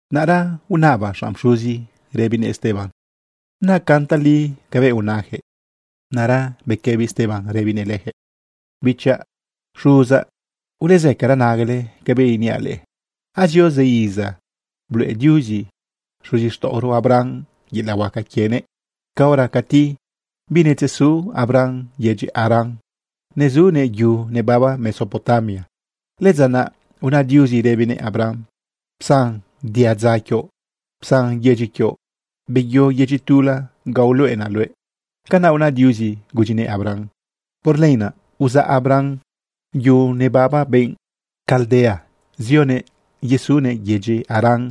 Naꞌra unaba xanꞌ pxuzi rëbinëꞌ Esteban: ―¿Nacan tali cabëꞌ unayaquëꞌ? Naꞌra bequëbi Esteban rëbinëꞌ leyaquëꞌ: ―Bichaꞌ, xuzaꞌ, ulezëcara nagale cabëꞌ iniaꞌ leꞌe. Azio zë iza, bluꞌe Diuzi xuzixtaꞌoro Abraham yelaꞌ huaca quienëꞌ caora cati binetzesu Abraham yedyi Harán, nezunëꞌ yu nebaba Mesopotamia. Lëdza naꞌ una Diuzi rëbinëꞌ Abraham: “Psan diadza quioꞌ, psan yedyi quioꞌ, beyo yedyi tula ga uluꞌenaꞌ luëꞌ.” Canaꞌ una Diuzi gudyinëꞌ Abraham. Por lenaꞌ uzaꞌ Abraham yu nebaba benꞌ Caldea, zionëꞌ yesunëꞌ yedyi Harán.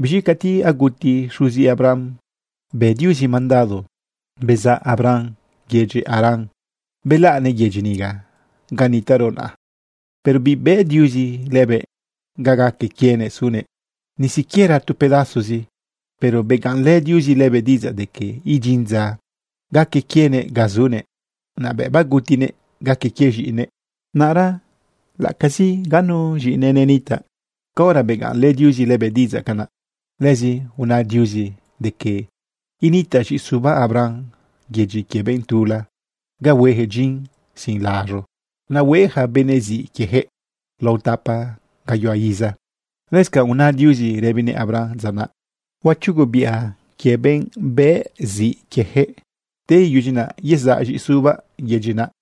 Biz̃i cati aguti xuzi Abraham, bë Diuzi mandado bezaꞌ Abraham yedyi Harán, belaꞌnëꞌ yedyi niga ga nitaꞌro naꞌa. Pero bibëꞌ Diuzi lëbëꞌ ga gaque quienëꞌ sunëꞌ, ni siquiera tu pedazozi. Pero begaꞌnlë Diuzi lëbëꞌ diꞌidzaꞌ de que idyin dza gaque quienëꞌ ga sunëꞌ, naꞌ bëꞌ bagutinëꞌ gaque quie z̃iꞌinëꞌ. Naꞌra laꞌacazi ga nu z̃iꞌinëꞌ nenitaꞌ caora, begaꞌnlë Diuzi lëbëꞌ diꞌidzaꞌ canaꞌ. Lëzi una Diuzi de que initaꞌ z̃iꞌisuba Abraham yedyi quie benꞌ tula ga hueyaquëꞌ dyin sin laz̃u, naꞌ hue yaca benëꞌ ziꞌ quieyaquëꞌ lao tapa gayuhua iza. Lëscanꞌ una Diuzi rëbinëꞌ Abraham dza naꞌ: “Huachugobiꞌa quie benꞌ bëꞌ ziꞌ quieyaquëꞌ. Te iyudyi naꞌ yezaꞌ z̃iꞌisubaꞌ yedyi naꞌ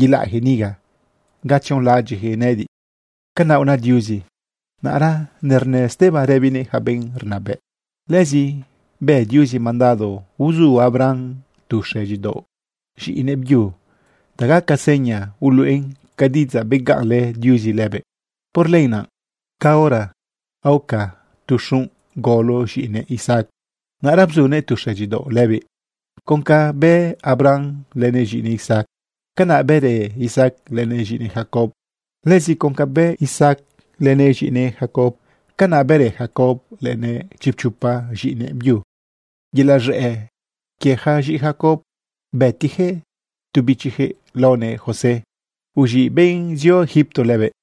yelaꞌjëꞌ niga ga tzionlaꞌadyiꞌyaquëꞌ nëꞌëdiꞌ.” Canaꞌ una Diuzi. Naꞌra nernë Esteban rëbinëꞌ yaca benꞌ rnabëꞌ: ―Lëzi bë Diuzi mandado uzu Abraham tu xëdyidaoꞌ z̃iꞌinëꞌ byu ta gaca seña uluꞌen ca diꞌidzaꞌ begaꞌnlë Diuzi lëbëꞌ. Por lenaꞌ, caora aoca tu xunꞌ golo z̃iꞌinëꞌ Isaac, naꞌra bzunëꞌ tu xëdyidaoꞌ lëbiꞌ. Con ca bë Abraham lënëꞌ z̃iꞌinëꞌ Isaac, canaꞌ bërë Isaac lënëꞌ z̃iꞌinëꞌ Jacob. Lëzi con ca bë Isaac lënëꞌ z̃iꞌinëꞌ Jacob, canaꞌ bërë Jacob lënëꞌ chipchopa z̃iꞌinëꞌ byu. Yelaꞌ z̃ëꞌ quie yaca z̃iꞌi Jacob, bëtiꞌyaquëꞌ tu bichiyaquëꞌ laonëꞌ José, uz̃iꞌ benꞌ zio Egipto lëbëꞌ.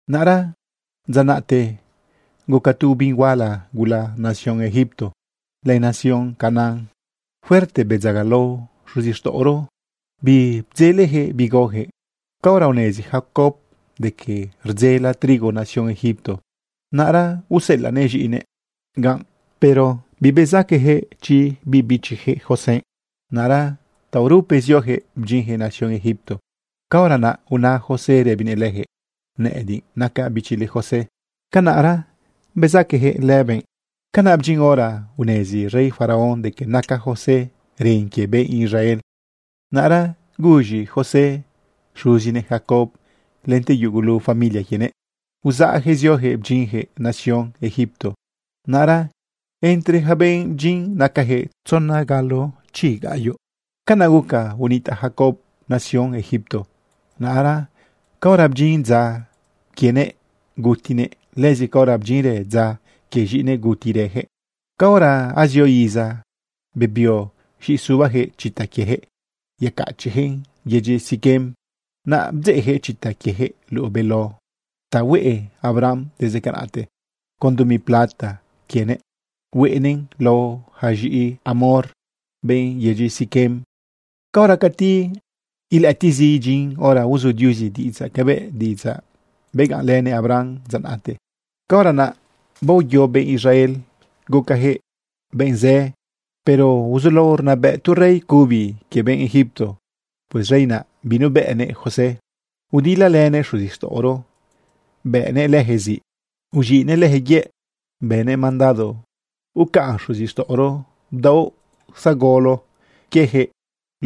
’Naꞌra dza naꞌte guca tu obin huala gula nación Egipto len nación Canaán. Fuerte bedzagalao xuzixtaꞌoro, bibdzeleyaquëꞌ bi gaoyaquëꞌ. Caora unezi Jacob de que rdzela trigo nación Egipto, naꞌra useꞌelaꞌnëꞌ z̃iꞌinëꞌ ganꞌ, pero bibezaqueyaquëꞌ chi biꞌ bichiyaquëꞌ José. Naꞌra taorupe zioyaquëꞌ bdyinyaquëꞌ nación Egipto, caora naꞌ una José rëbinëꞌ leyaquëꞌ: “Nëꞌëdiꞌ nacaꞌ bichile, José.” Canaꞌra bezaqueyaquëꞌ lëbëꞌ. Canaꞌ bdyin hora unezi rey Faraón de que naca José ren quie benꞌ Israel. Naꞌra guz̃i José xuzinëꞌ Jacob lente yugulu familia quienëꞌ, uzaꞌyaquëꞌ zioyaquëꞌ bdyinyaquëꞌ nación Egipto. Naꞌra entre yaca benꞌ bdyin nacajëꞌ tzona galo chiꞌinuꞌ. Canaꞌ guca unitaꞌ Jacob nación Egipto. Naꞌra caora bdyin dza quienëꞌ, gutinëꞌ. Lëzi caora bdyinrë dza quie z̃iꞌinëꞌ, gutirëyaquëꞌ. Caora azio iza, bebio z̃iꞌi subayaquëꞌ chita quieyaquëꞌ yecachiꞌyaquëꞌn yedyi Siquem. Naꞌ bdzeꞌyaquëꞌ chita quieyaquëꞌ luꞌu beló ta hueꞌ Abraham desde canaꞌte. Con dumi plata quienëꞌ hueꞌnëꞌn lao ja z̃iꞌi Hamor, benꞌ yedyi Siquem. ’Caora cati ilëꞌëtiꞌzi idyin hora uzu Diuzi diꞌidzaꞌ cabëꞌ diꞌidzaꞌ begaꞌnlënëꞌ Abraham dza naꞌte, caora naꞌ baoye benꞌ Israel gucajëꞌ benꞌ zë. Pero uzulao rnabëꞌ tu rey cubi quie benꞌ Egipto. Pues rey naꞌ, binubëꞌnëꞌ José. Udilalënëꞌ xuzixtaꞌoro, bëꞌnëꞌ leyaquëꞌ ziꞌ, uz̃iꞌnëꞌ leyaquëꞌ yëꞌ, bënëꞌ mandado ucaꞌn xuzixtaꞌoro bdaoꞌ zagolo quieyaquëꞌ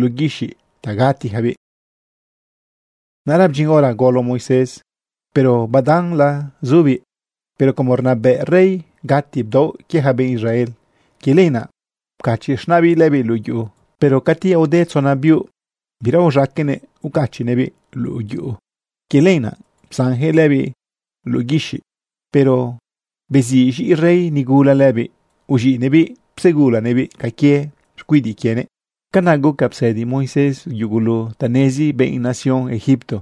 luꞌu guixiꞌ ta gatiyacabiꞌ. Naꞌra bdyin hora golo Moisés, pero badanla zubiꞌ. Pero como rnabëꞌ rey gati bdaoꞌ quie ja benꞌ Israel, quie lenaꞌ pcachiꞌ z̃naꞌbiꞌ lëbiꞌ luꞌu yuꞌu. Pero cati aode tzona biuꞌ, bira uz̃aqueꞌnëꞌ ucachiꞌnëꞌbiꞌ luꞌu yuꞌu. Quie lenaꞌ psanyaquëꞌ lëbiꞌ luꞌu guixiꞌ, pero beziꞌ z̃iꞌi rey nigula lëbiꞌ, uz̃iꞌnëꞌbiꞌ psegulanëꞌbiꞌ ca quie xcuidiꞌ quienëꞌ. Canaꞌ guca psëdi Moisés yugulu ta nezi benꞌ nación Egipto.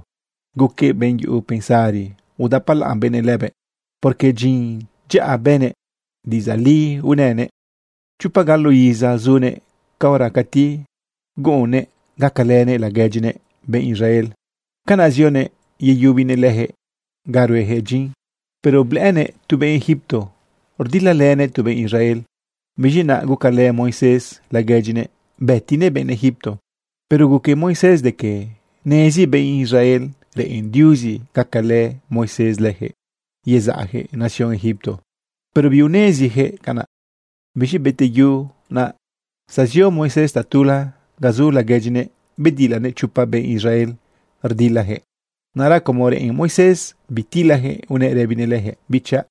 Guquëꞌ benꞌ yuꞌu pensari, udapalaꞌn benëꞌ lëbëꞌ, porque dyin dyaꞌa bënëꞌ, diꞌidzaꞌ li unënëꞌ. ’Chopa galo iza zunëꞌ caora cati guꞌunnëꞌ gacalënëꞌ laguedyinëꞌ benꞌ Israel. Canaꞌ zionëꞌ yeyubinëꞌ leyaquëꞌ ga rueyaquëꞌ dyin. Pero blëꞌënëꞌ tu benꞌ Egipto rdilalënëꞌ tu benꞌ Israel. Biz̃i naꞌ gucalë Moisés laguedyinëꞌ, bëtinëꞌ benꞌ Egipto. Pero guque Moisés de que nezi benꞌ Israel reꞌen Diuzi gacalë Moisés leyaquëꞌ yezaꞌyaquëꞌ nación Egipto. Pero biuneziyaquëꞌ canaꞌ. Biz̃i bete yu naꞌ, zezio Moisés tatula ga zu laguedyinëꞌ bedilanëꞌ chopa benꞌ Israel rdilayaquëꞌ. Naꞌra como reꞌen Moisés bitilayaquëꞌ, unëꞌ rëbinëꞌ leyaquëꞌ: “¡Bichaꞌ!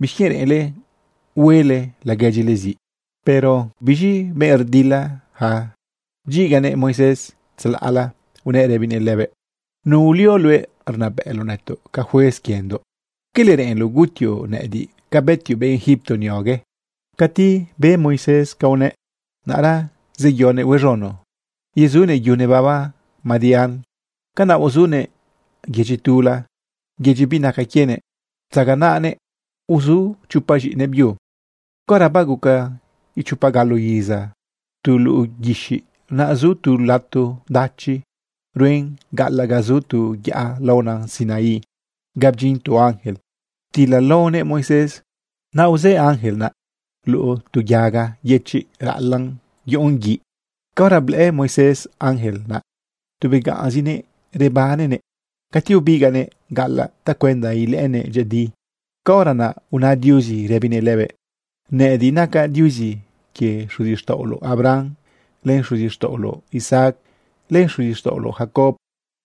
¿Bixquienꞌ reꞌenle hueꞌle laguedyile ziꞌ?” Pero biz̃i benꞌ rdilayaca bdyiganëꞌ Moisés tzalaꞌla, unëꞌ rëbinëꞌ lëbëꞌ: “¿Nu ulio luëꞌ rnabëꞌloꞌ nëtoꞌ ca juez quiendoꞌ? ¿Quele reꞌenloꞌ gutioꞌ nëꞌëdiꞌ ca bëtioꞌ benꞌ Egipto niogue?” Cati be Moisés ca unëꞌ, naꞌra zeyonëꞌ huez̃uno yesunëꞌ yu nebaba Madián. Canaꞌ uzunëꞌ yedyi tula, yedyi binacan quienëꞌ, ptzaganaꞌnëꞌ uzu chopa z̃iꞌinëꞌ byu. ’Caora baguca ichopa galo iza tu luꞌu guixiꞌ, naꞌ zu tu lato dachi ruen gaꞌalaꞌ ga zu tu yaꞌa laona Sinaí ga bdyin tu ángel ptilalaonëꞌ Moisés. Naꞌ uzë ángel naꞌ luꞌu tu yaga yëchiꞌ raꞌalaꞌn yuꞌun guiꞌ. Caora blëꞌë Moisés ángel naꞌ, tu begaꞌnzinëꞌ rebannëꞌ. Cati ubigaꞌnëꞌ gaꞌalaꞌ tacuenda ilëꞌënëꞌ dyëꞌëdi, caora naꞌ una Diuzi rëbinëꞌ lëbëꞌ: “Nëꞌëdiꞌ nacaꞌ Diuzi quie xuzixtaꞌoloꞌ Abraham, len xuzixtaꞌoloꞌ Isaac, len xuzixtaꞌoloꞌ Jacob.”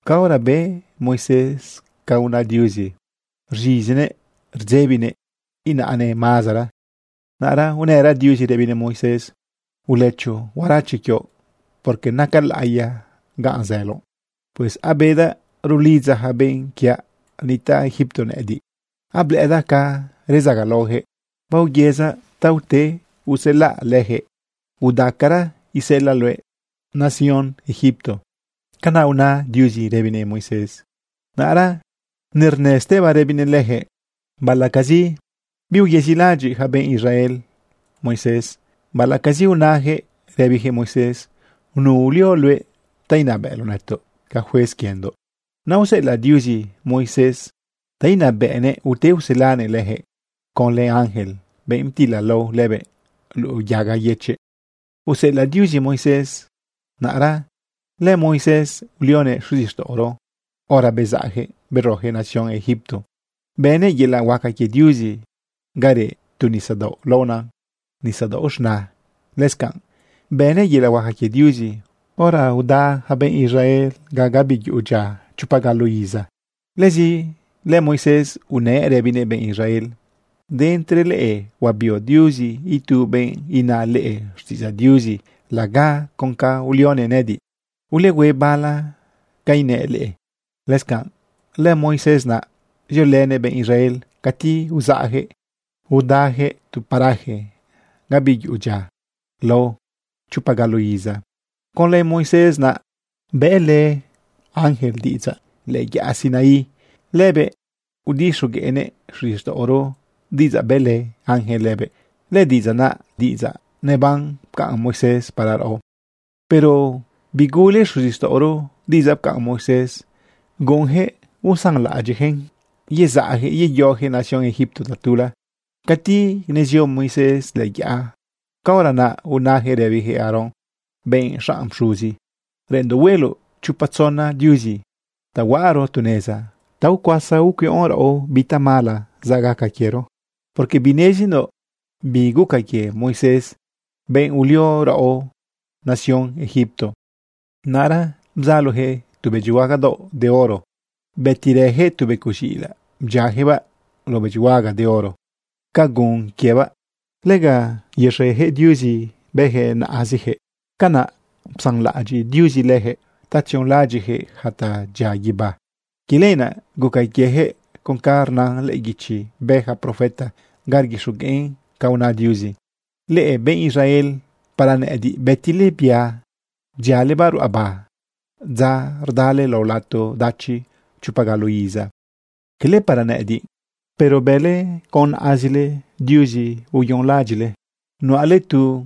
Caora be Moisés ca una Diuzi, rz̃izinëꞌ rdzebinëꞌ inaꞌnëꞌ mazera. Naꞌra unëra Diuzi rëbinëꞌ Moisés: “Ulëcho huarache quioꞌ porque naca laꞌiya ga zëloꞌ. Pues abedaꞌ rulidza ja benꞌ quiaꞌ nitaꞌ Egipto nëꞌëdiꞌ. Ablëꞌëdaꞌ ca redzagalaojëꞌ. Baoyëzaꞌ ta ute uselaꞌ leyaquëꞌ. Udacara, iseꞌelaꞌ luëꞌ nación Egipto.” Canaꞌ una Diuzi rëbinëꞌ Moisés. Naꞌra nernë Esteban rëbinëꞌ leyaquëꞌ: ―Baꞌalaꞌcazi biuyezilaꞌadyiꞌ yaca benꞌ Israel Moisés, baꞌalaꞌcazi unayaquëꞌ rëbiyaquëꞌ Moisés: “¿Nu ulio luëꞌ ta inabëꞌloꞌ nëtoꞌ ca juez quiendoꞌ?”, naꞌ useꞌelaꞌ Diuzi Moisés ta inabëꞌnëꞌ ute uselanëꞌ leyaquëꞌ. Conlë ángel, benꞌ ptilalao lëbëꞌ luꞌu yaga yëchiꞌ, useꞌelaꞌ Diuzi Moisés. Naꞌra lëMoisés ulionëꞌ xuzixtaꞌoro hora bezaꞌyaquëꞌ beroyaquëꞌ nación Egipto, bënëꞌ yelaꞌ huaca quie Diuzi ga reꞌ tu nisadaoꞌ laona Nisadaoꞌ Z̃na. Lëscanꞌ bënëꞌ yelaꞌ huaca quie Diuzi hora uda yaca benꞌ Israel gabi yuꞌu dyia chopa galo iza. Lëzi lëMoisés unëꞌ rëbinëꞌ benꞌ Israel: “De entre leꞌe huabio Diuzi itu benꞌ ina leꞌe xtiꞌidzaꞌ Diuzi laga con ca ulionëꞌ nëꞌëdiꞌ. Ulehue bala ca inëꞌ leꞌe.” Lëscanꞌ lëMoisés naꞌ ziolënëꞌ benꞌ Israel cati uzaꞌyaquëꞌ udayaquëꞌ tu paraje gabi yuꞌu dyia lao chopa galo iza. Conlë Moisés naꞌ bëꞌlë ángel diꞌidzaꞌ lëꞌë yaꞌa Sinaí. Lëbëꞌ udixogueꞌnëꞌ xuzixtaꞌoro diꞌidzaꞌ bëꞌlë ángel lëbëꞌ. Lëdiꞌidzaꞌ naꞌ, diꞌidzaꞌ neban, pcaꞌn Moisés para raꞌo. ’Pero bigule xuzixtaꞌoro diꞌidzaꞌ pcaꞌn Moisés. Guꞌunyaquëꞌ uzaꞌlaꞌadyiꞌjëꞌn yezaꞌjëꞌ yeyoyaquëꞌ nación Egipto tatula. Cati nezio Moisés lëꞌë yaꞌa, caora naꞌ unayaquëꞌ rëbiyaquëꞌ Aarón, benꞌ xanꞌ pxuzi: “Reꞌenndoꞌ hueloꞌ chopa tzona diuzi ta huaꞌaro tu neza ta ucuasa ucuiꞌon raꞌo bi tamala zaꞌ gaca quiero, porque binezindoꞌ bi guca quie Moisés, benꞌ ulio raꞌo nación Egipto.” Naꞌra bzaloyaquëꞌ tu bëdyihuaga daoꞌ de oro. Bëtirëyaquëꞌ tu becoꞌ z̃iꞌilaꞌ bdyiayaquëꞌbaꞌ lao bëdyihuaga de oro ca gun quiebaꞌ. Lega yexeyaquëꞌ diuzi bëyaquëꞌ naꞌaziyaquëꞌ. Canaꞌ psanlaꞌadyiꞌ Diuzi leyaquëꞌ ta tzionlaꞌadyiꞌyaquëꞌ yaca tadyia guibá. Quie lenaꞌ guca quieyaquëꞌ con ca rna lëꞌë guichi bë yaca profeta ga rguixogueꞌn ca una Diuzi: Leꞌe benꞌ Israel, ¿para nëꞌëdiꞌ bëtile bia bdyialebaꞌ ruꞌaba dza rdale lao lato dachi chopa galo iza? Quele para nëꞌëdiꞌ, pero bële con naꞌazile diuzi uyonlaꞌadyiꞌle. Nuꞌale tu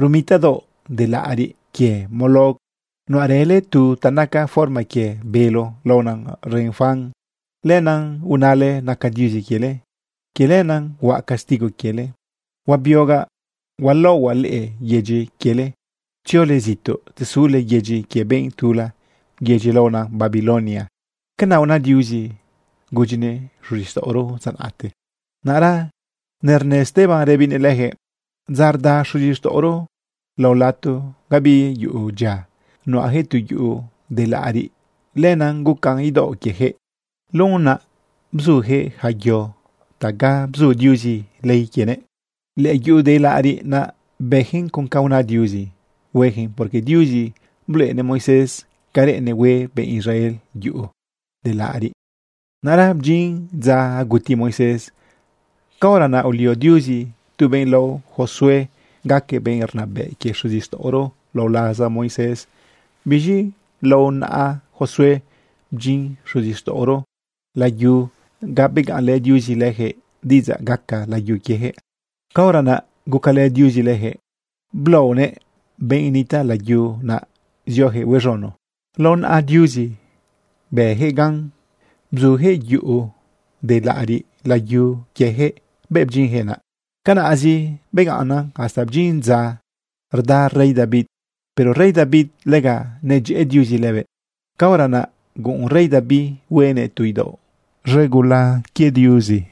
rumita daoꞌ de laꞌariꞌ quie Moloc. Nuꞌarële tu ta naca forma quie bélo, laona Renfán. Lenaꞌ unale naca Diuzi quiele. Quie lenaꞌ huaꞌ castigo quiele, huabiogaꞌ hualaohuaꞌ leꞌe yedyi quiele tziole zituꞌ, tzesule yedyi quie benꞌ tula yedyi laona Babilonia. Canaꞌ una Diuzi gudyinëꞌ xuzixtaꞌoro dza naꞌte. Naꞌra nernë Esteban rëbinëꞌ leyaquëꞌ: ―Dza rda xuzixtaꞌoro lao lato gabi yuꞌu dyia, nuꞌayaquëꞌ tu yuꞌu de laꞌariꞌ, lenaꞌ gucan idaoꞌ quieyaquëꞌ. Luꞌen naꞌ bzuyaquëꞌ yaca yo taꞌa ga bzu Diuzi ley quienëꞌ. Lëyuꞌu de laꞌariꞌ naꞌ, bëyaquëꞌn con ca una Diuzi hueyaquëꞌn, porque Diuzi bluꞌenëꞌ Moisés ca reꞌennëꞌ hue benꞌ Israel yuꞌu de laꞌariꞌ. Naꞌra bdyin dza aguti Moisés. Caora naꞌ ulio Diuzi tu benꞌ lao Josué gaquëꞌ benꞌ rnabëꞌ quie xuzixtaꞌoro lao laza Moisés. Biz̃i lao naꞌa Josué bdyin xuzixtaꞌoro layu ga begaꞌnlë Diuzi leyaquëꞌ diꞌidzaꞌ gaca layu quieyaquëꞌ. Caora naꞌ gucalë Diuzi leyaquëꞌ blaonëꞌ benꞌ nitaꞌ layu naꞌ zioyaquëꞌ huez̃uno. Lao naꞌa Diuzi bëyaquëꞌ gan, bzuyaquëꞌ yuꞌu de laꞌariꞌ layu quieyaquëꞌ bëꞌ bdyinjëꞌ naꞌ. Canaꞌzi begaꞌnnan hasta bdyin dza rda rey David. Pero rey David, lega nedyëꞌë Diuzi lëbëꞌ. Caora naꞌ guꞌun rey David huenëꞌ tu idaoꞌ z̃egula ga initaꞌ Diuzi.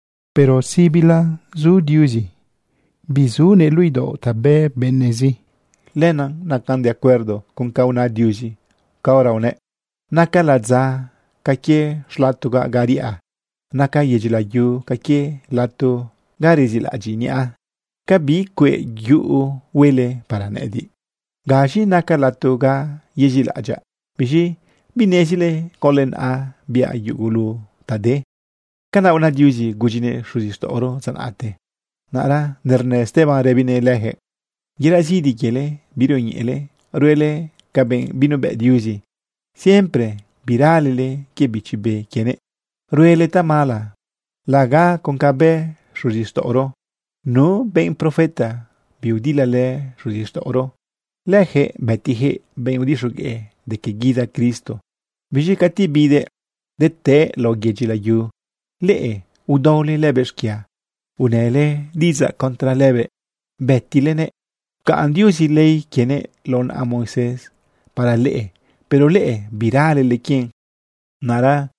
Pero sibila zu Diuzi, binitaꞌnëꞌ luꞌu idaoꞌ ta bë benëꞌzi. Lenaꞌ nacan de acuerdo con ca una Diuzi caora unëꞌ: Naca ladza ca quie xlatogaꞌ ga riꞌa. Naca yedyi layu ca quie lato ga rezilaꞌadyiꞌ niꞌa. ¿Ca bi cueꞌ yuꞌu huele para nëꞌëdiꞌ? ¿Gaz̃i naca lato ga yezilaꞌadyaꞌ? ¿Biz̃i binezile conlë naꞌa biaꞌ yugulu ta de? Canaꞌ una Diuzi gudyinëꞌ xuzixtaꞌoro dza naꞌte. Naꞌra nernë Esteban rëbinëꞌ leyaquëꞌ: ―Yelaꞌ zidi quiele birioñeꞌele ruele ca benꞌ binubëꞌ Diuzi. Siempre biralele quie Bichi Be quienëꞌ. Ruele tamala laga con ca bë xuzixtaꞌoro. ¿Nu benꞌ profeta biudilalë xuzixtaꞌoro? Leyaquëꞌ bëtiyaquëꞌ benꞌ udixogueꞌ de que guida Cristo. Biz̃i cati bidëꞌ detëꞌë lao yedyi layu, leꞌe udaole lëbëꞌ xquia, unële diꞌidzaꞌ contra lëbëꞌ, bëtilenëꞌ. Pcaꞌn Diuzi ley quienëꞌ lao naꞌa Moisés para leꞌe, pero leꞌe, biralele quien. Naꞌra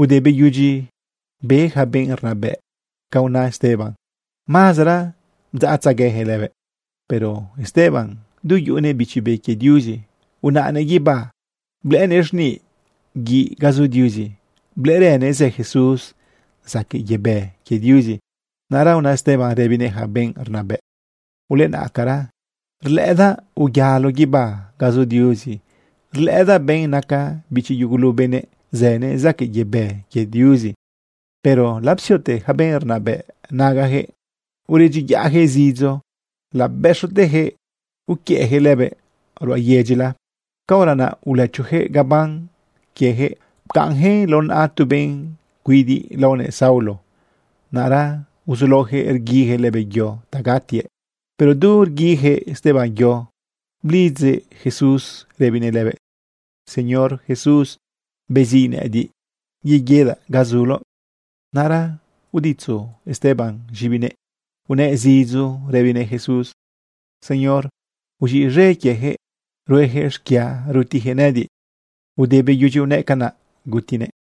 ude beyudyi be yaca benꞌ rnabëꞌ ca una Esteban, mazera bdzaꞌtzegueyaquëꞌ lëbëꞌ. Pero Esteban, du yuꞌunëꞌ Bichi Be quie Diuzi, unaꞌnëꞌ guibá blëꞌënëꞌ xniꞌ guiꞌ ga zu Diuzi. Blëꞌërënëꞌ zë Jesús zaquëꞌ yebë quie Diuzi. Naꞌra una Esteban rëbinëꞌ yaca benꞌ rnabëꞌ: ―¡Ulenaꞌcara! Rlëꞌëdaꞌ uyalo guibá ga zu Diuzi. Rlëꞌëdaꞌ benꞌ naca bichi yugulu benëꞌ. Zënëꞌ zaquëꞌ yebë quie Diuzi. Pero lapsiote yaca benꞌ rnabëꞌ nagayaquëꞌ, uredyiyaꞌyaquëꞌ zidzo, labëxoteyaquëꞌ uquiëꞌyaquëꞌ lëbëꞌ ruꞌa yedyila. Caora naꞌ ulëchoyaquëꞌ gaban quieyaquëꞌ pcaꞌnyaquëꞌn lao naꞌa tu benꞌ cuidiꞌ laonëꞌ Saulo. Naꞌra uzulaoyaquëꞌ rguiyaquëꞌ lëbëꞌ yo ta gatiëꞌ. Pero du rguiyaquëꞌ Esteban yo, blidzëꞌ Jesús rëbinëꞌ lëbëꞌ: ―Señor Jesús, beziꞌ nëꞌëdiꞌ yeguidaꞌ ga zuloꞌ. Naꞌra uditzu Esteban z̃ibinëꞌ, unëꞌ zidzo rëbinëꞌ Jesús: ―Señor, uz̃iꞌz̃e quieyaquëꞌ rueyaquëꞌ xquia rutiyaquëꞌ nëꞌëdiꞌ. Ude beyudyi unëꞌ canaꞌ, gutinëꞌ.